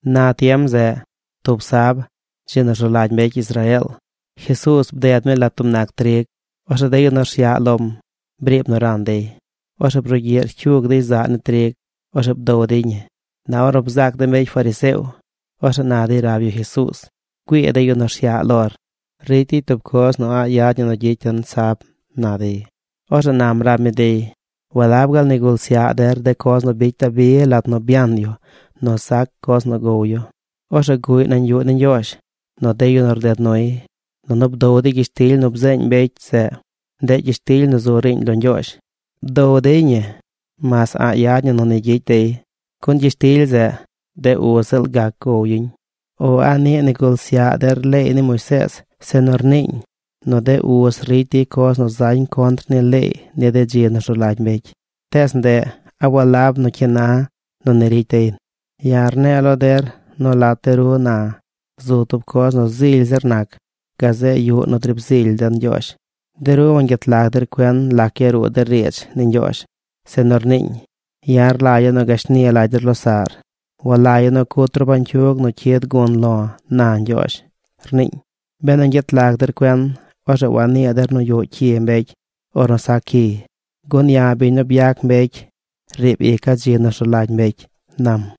Na tiem zeꞌ, tub sab, dzi nu rzu lagy mbecy Israeel, Jesuuz bded mi lat tub nac trig. Orzeꞌ de yu nu rsyaꞌ lom briib nu ran dey. Orzeꞌ brugyiꞌ rcyug dey zaꞌ ni trig. Orzeꞌ bdow dey ñi. Na ornu bzaac de mbecy fariseo, orzeꞌ na dey rab yu Jesuuz: ―Güii de yu nu rsyaꞌ lor. Ricy dey tub coz nu a̱ꞌ yad ñi nu gyicy den sab ―na dey. Orzeꞌ nam rab mi dey: ―¿Walab gaal nigul syaꞌ der coz nu bicy Dabi lat nu byan yu nu sac coz nu gow yu? Orzeꞌ guꞌy nañ yuꞌ ni Ñgyoozh nu de yu nu rded nuy. Nunu bdow dey gyishtily nu bzeeñ mbecy zeꞌ. Ndeꞌ gyishtily nu zu riiñ lo Ñgyoozh. Bdow dey ñi mas a̱ꞌ yad ñi nu ni gyicy dey. Gun gyishtily zeꞌ, de uz ziꞌl gac gow yuñ. ¿O a niꞌ nigul syaꞌ der leey ni Moisees zeꞌ nu rniiñ nu de uz ricy dey coz nu zañ contr ni leey ni dzi nu rzu lagy mbecy; tees ndeꞌ a walab nu cyi na nu ni ricy dey? Ya̱ rne̱e̱ lo der nu lat de ru na zu tub coz nu zily zir nac gazeꞌ yuꞌ nu driib zily den Ñgyoozh. De ru wangyet lag der cuen lac yaruu de riidz ni Ñgyoozh, zeꞌ nu rniiñ: “Ya̱ rlagya̱ nu gashni lagy der losaꞌr. Walagya̱ nu cut ru bañcyug nu cyid gun lo̱, na Ñgyoozh”, rniiñ. Benu ñgyet lag der cuen, orzeꞌ wanii der nu yuꞌ cyi mbecy ornu sac cyiy. Gun ya̱, biñ nu byac mbecy, riib ica̱ dzi nu rzu lagy mbecy ―nam.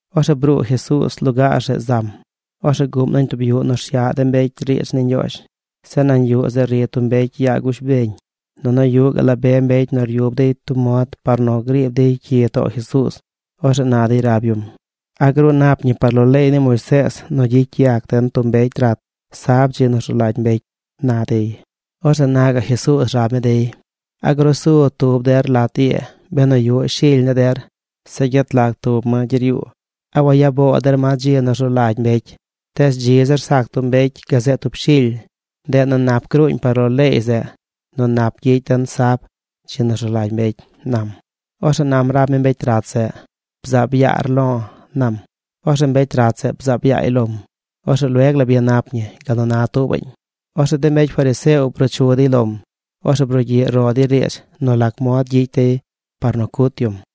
Orzeꞌ bruu Jesuuz lugaar zeꞌ zam. Orzeꞌ guꞌm nañ tub yuꞌ nu rsyaꞌ de mbecy riidz ni Ñgyoozh. Zeꞌ nañ yuꞌ zeꞌ ri tub mbecy yaa gush beñ. Nunu yuꞌ gaꞌ la be mbecy nu ryub dey tub mod par nu griib dey cyi too Jesuuz. Orzeꞌ na dey rab yum: ―¿A gruu nap ñi par lo leey ni Moisees nu gyicy yac den tub mbecy rat sab, dzi nu rzu lagy mbecy? ―na dey. Orzeꞌ na gaꞌ Jesuuz rab mi dey: ―¿A grusu tub der lat ii benu yuꞌ shily ni der, zeꞌ gyet lag tub ma gyeryuu, a waya boo der ma dzi nu rzu lagy mbecy? Tees dzi zir sac tub mbecy gazeꞌ tub shily. Ndeꞌ nu nap gruuñ par lo leey zeꞌ nu nap gyicy den sab, dzi nu rzu lagy mbecy ―nam. Orzeꞌ nam rab mi mbecy rat zeꞌ: ―Bzaab yaar lo̱ ―nam. Orzeꞌ mbecy rat zeꞌ bzaab yaay lom. Orzeꞌ lueg la byanap ñi gal nu na tuubañ. Orzeꞌ de mbecy fariseo bruu chu dey lom. Orzeꞌ brugyiꞌ ro dey riidz nu lac mod gyicy dey par nu cut yum.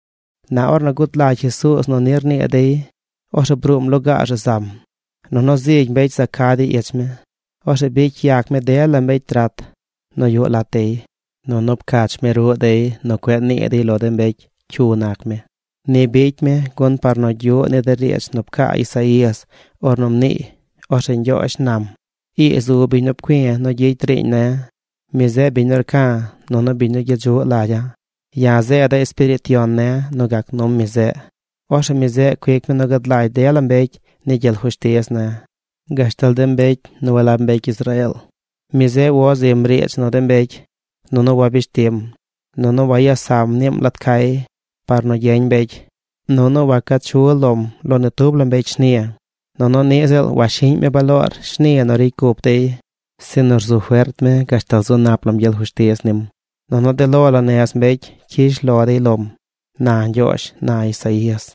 Na ornu gud lagy Jesuuz nu ni rnii dey, orzeꞌ bruum lugaar zeꞌ zam. Nunu zigy mbecy za ca dey ich mi. Orzeꞌ bicy yac mi dela mbecy rat nu yuꞌ lat dey. Nunu pcach mi ruꞌ dey nu cueꞌ nii dey lo de mbecy cyu nac mi. Ni bicy mi gun par nu gyuꞌ ni de riidz nu pcaa Isaías ornu mniiy: Orzeꞌ Ñgyoozh nam: Ii zu biñ nu pcui̱ nu gyicy riiñ ne̱. Mi zeꞌ biñ nu rca̱ nunu biñ nu gyedzuꞌ lagya̱. Ya̱ zeeda̱ Espiriit Yon ne̱ nu gac num mi zeꞌ. Orzeꞌ mi zeꞌ cuic mi nu gad lagy dela mbecy ni gyel fushtiz ne̱, gashtal de mbecy nu walab mbecy Israeel. Mi zeꞌ wo zim riidz nu de mbecy, nunu wabish tim. Nunu waya sam niim lat cay par nu gyeñ mbecy. Nunu waca chu lom lo ni tub la mbecy shni. Nunu niꞌ ziꞌl washiꞌñ mi baloor shni nu ricy cup dey. Sinu rzu fert mi gashtal zu nap lam gyel fushtiz nim. Nunu de lo la nez mbecy cyish lo dey lom, na Ñgyoozh, na Isaías.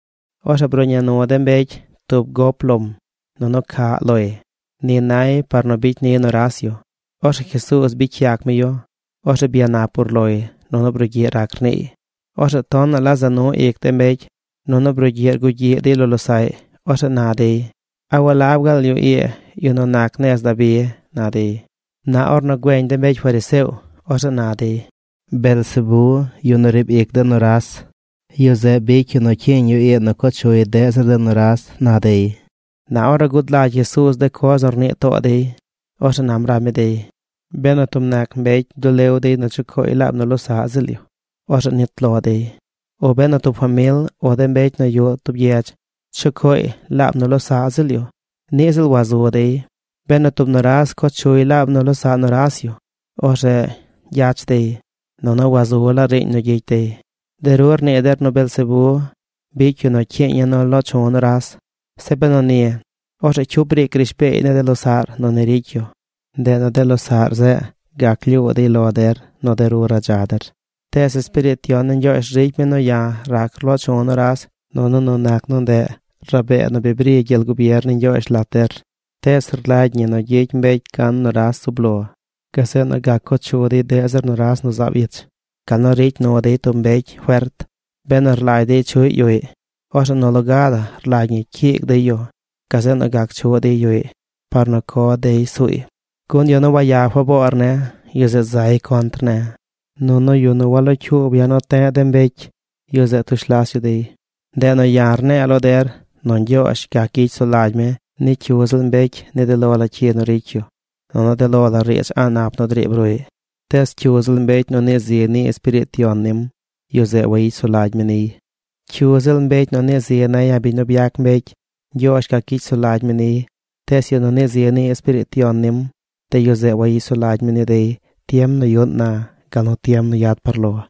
Orzeꞌ bruꞌña nu de mbecy tub gop lom, nunu caꞌ loy. Ni nay par nu bicy ni nuras yu. Orzeꞌ Jesuuz bicy yac mi yu. Orzeꞌ byanap urloy nunu brugyiꞌ rac rniiy. Orzeꞌ tonaꞌ la za nu ic de mbecy nunu brugyiꞌ rgugyiꞌ dey lo losaꞌy. Orzeꞌ na dey: ―¿A walab gaal yu ii yu nu nac nez Dabi? ―na dey. Na ornu güeñ de mbecy fariseo, orzeꞌ na dey: ―Beelzebé, yu nu riib ic de nuras, yu zeꞌ bicy yu nu cyiiñ yu ii nu co chuy deꞌ zir de nuras ―na dey. Na ornu gud lagy Jesuuz de coz nu rnii too dey, orzeꞌ nam rab mi dey: ―Benu tub nac mbecy dulew dey nu chucooy laab nu losaꞌ ziꞌl yu, orzeꞌ nit lo dey. O benu tub famil o de mbecy nu yuꞌ tub gyedz chucooy laab nu losaꞌ ziꞌl yu, niꞌ ziꞌl wazu dey. Benu tub nuras co chuy laab nu losaꞌ nuras yu, orzeꞌ gyach dey, nunu wazu laa riiñ nu gyicy dey. De ru rnii der nu Beelzebé bicy yu nu cyiiñ ya̱ nu loo chu̱ nuras. Zeꞌ benu ni, orzeꞌ ¿cyu briic rishbeey ni de losaꞌr nu ni ricy yu? Ndeꞌ nu de losaꞌr zeꞌ gac lyuu dey lo der nu de ru radza der. Tees Espiriit Yon ni Ñgyoozh ricy mi nu ya̱ rac rloo chu̱ nuras, nunu nu nac nu ndeꞌ rabee nu bi bri gyel gubier ni Ñgyoozh lat der. ’Tees rlagy ñi nu gyicy mbecy gan nuras zub lo, gazeꞌ nu gac co chu dey deꞌ zir nuras nu zaab ich. Gal nu ricy nu dey tub mbecy fert. Benu rlagy dey chuꞌy yuꞌy, orzeꞌ nu loga la rlagy ñi cyiig dey yu. Gazeꞌ nu gac chuꞌ dey yuꞌy par nu co dey suuy. ’Gun yu nu waya faboor ne̱, yu zeꞌ zay contr ne̱. Nunu yu nu walocyuub ya̱ nu te̱ꞌ de mbecy, yu zeꞌ tush las yu dey. ’Ndeꞌ nu ya̱ rne̱e̱ lo der nu Ñgyoozh gac gyicy sulagy mi ni cyu ziꞌl mbecy ni de lo la cyi nu ricy yu nunu de lo la riidz a̱ꞌ nap nu driib ruꞌy. Tees cyu ziꞌl mbecy nu nii zi ni Espiriit Yon nim, yu zeꞌ wayicy sulagy mi niy. Cyu ziꞌl mbecy nu nii zi ne̱ ya̱ biñ nu byac mbecy, Ñgyoozh gac gyicy sulagy mi niy. Tees yu nu nii zi ni Espiriit Yon nim, de yu zeꞌ wayicy sulagy mi ni dey tiem nu yuꞌn na, gal nu tiem nu yad par lo.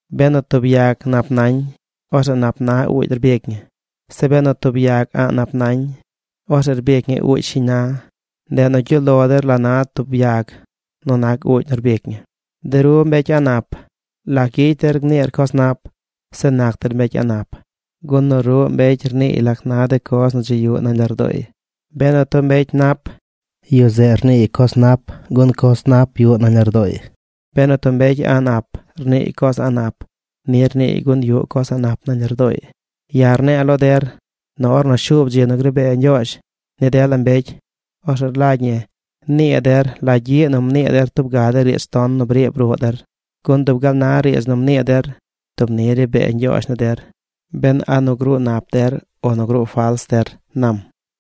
’Benu tub yag nap nañ, orzeꞌ nap na uugy rbic ñi. Zeꞌ benu tub yag a̱ꞌ nap nañ, orzeꞌ rbic ñi uugy shiñ na. Ndeꞌ nu gyuꞌ lo der la na tub yag nu nac uugy nu rbic ñi. ¡De ru, mbecy a̱ꞌ nap! ¿Lac gyicy der gniir coz nap, zeꞌ nac der mbecy a̱ꞌ nap? Gun nu ruꞌ mbecy rniiy lac na de coz nu dzi yuꞌ nañ lardooy. Benu tub mbecy nap, yu zeꞌ rniiy coz nap gun coz nap yuꞌ nañ lardooy. Benu tub mbecy a̱ꞌ nap, rniiy coz a̱ꞌ nap. Ni rniiy gun yuꞌ coz a̱ꞌ nap nañ lardooy. Ya̱ rne̱e̱ lo der nu ornu shuub dzi nu ri bee Ñgyoozh ni dela mbecy, orzeꞌ rlagy ñi nii der la gyiꞌ nu mnii der tub ga de riidz ton nu briib ruꞌ der. Gun dub gal na riidz nu mnii der, dub ni ri bee Ñgyoozh ni der, ben a nu gruu nap der o nu gruu fals der ―nam.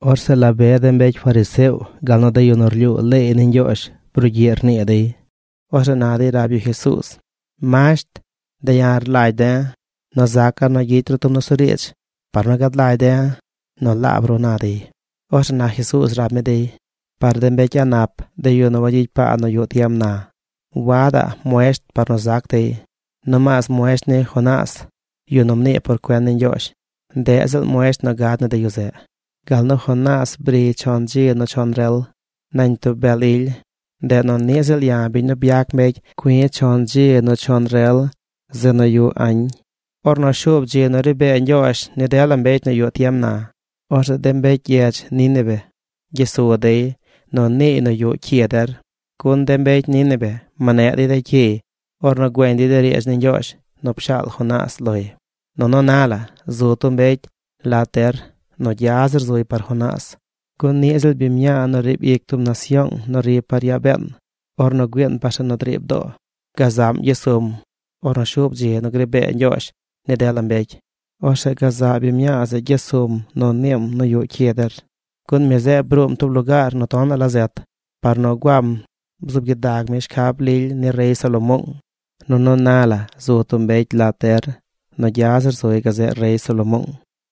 Orzeꞌ la be de mbecy fariseo gal nu de yu nu rlyuu leey ni Ñgyoozh brugyiꞌ rnii dey. Orzeꞌ na dey rab yu Jesuuz: ―Masht, de̱ ya̱ rlagy de̱ nu zaca̱ nu gyicy ru tub nusuriidz par nu gad lagy de̱ nu laab ru ―na dey. Orzeꞌ na Jesuuz rab mi dey: ―Par de mbecy a̱ꞌ nap, de yu nu wagyicy paa nu yuꞌ tiem na, wadaꞌ muesht par nu zac dey. Nomaas muesht ni Jonás, yu nu mnii por cuen ni Ñgyoozh, ndeꞌ ziꞌl muesht nu gad ni de yu zeꞌ. Gal nu Jonás briy chon dzi nu chon rel nañ tub bel ily, ndeꞌ nu niꞌ ziꞌl ya̱, biñ nu byac mbecy cui̱ chon dzi nu chon rel zeꞌ nu yuꞌ añ. Ornu shuub dzi nu ri bee Ñgyoozh ni dela mbecy nu yuꞌ tiem na, orzeꞌ de mbecy gyedz Nínive gyes su dey nu niiy nu yuꞌ cyi der. Gun de mbecy Nínive mneꞌ dey cyiy ornu güeñ dey de riidz ni Ñgyoozh nu pshaal Jonás loy. Nunu na la, zu tub mbecy lat der nu gya zir zuy par Jonás. Gun niꞌ ziꞌl biñ mñaa nu riib ic tub nasyoong nu ri par yaa been ornu güiin par zeꞌ nu driib doo, gazaꞌm gyes sum ornu shuub dzi nu gri bee Ñgyoozh ni dela mbecy. Orzeꞌ gazaꞌ biñ mñaa zeꞌ gyes suum nu niim nu yuꞌ cyi der, gun mi zeꞌ bruum tub lugaar nu tonaꞌ la zet par nu guam bzuub gyidag mi shcab lily ni rey Salomoong, nunu na la zu tub mbecy lat der nu gya zir zuy gazeꞌ rey Salomoong.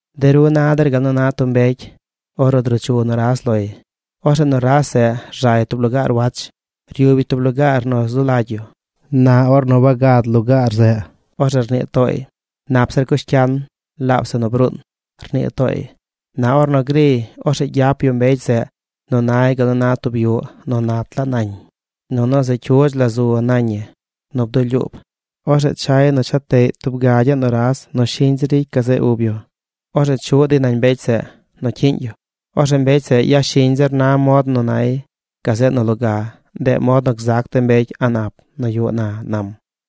’De ru na der gal nu na tub mbecy ornu druu chu nuras loy. Orzeꞌ nuras zeꞌ rzay tub lugaar wach. Ryub yu tub lugaar nu zu lagy yu. Na ornu wagad lugaar zeꞌ, orzeꞌ rnii tooy: “Nap zir cush cyan, laab zeꞌ nu bruun”, rnii tooy. Na ornu griy, orzeꞌ gyap yu mbecy zeꞌ nu nay gal nu na tub yuꞌ nu nat laa nañ, nunu se cyudz la zu nañ ñi nu bdulyuub. Orzeꞌ chay nu cha teꞌy tub gagyaꞌ nuras nu shiñ zir ricy gazeꞌ ub yu. Orzeꞌ chuꞌ dey nañ mbecy zeꞌ nu cyiiñ yu. Orzeꞌ mbecy zeꞌ yashiñ zir na mod nu nay, gazeꞌ nu loga. Ndeꞌ mod nu gzac de mbecy a̱ꞌ nap nu yuꞌ na ―nam.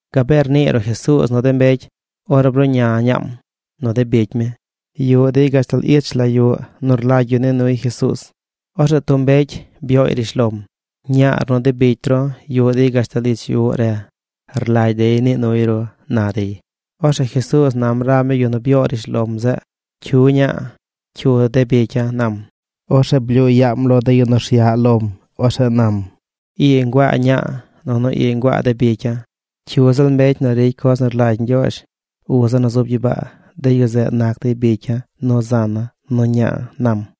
Gabee rnii ruꞌ Jesuuz nu de mbecy, ornu bruꞌña ñaam nu de bicy mi. Yuꞌ dey gashtal ich la yuꞌ nu rlagy yu nii nuy Jesuuz. Orzeꞌ tub mbecy byooy rishlom: ―Ñaar nu de bicy ru yuꞌ dey gashtal ich yuꞌ re. Rlagy dey nii nuy ru ―na dey. Orzeꞌ Jesuuz nam rab mi yu nu byoo rishlom zeꞌ: ―¿Cyu ña̱a̱, cyu de bicya̱? ―nam. Orzeꞌ blyuu yaam lo de yu nu rsyaꞌ lom. Orzeꞌ nam: ―Ii nguaa ña̱a̱ nunu ii nguaa de bicya̱. Cyu ziꞌl mbecy nu ricy coz nu rlagy Ñgyoozh, uza̱ nu zub gyibaa, de yu zeꞌ nac dey bicya̱ nu zana̱ nu ña̱a̱ ―nam.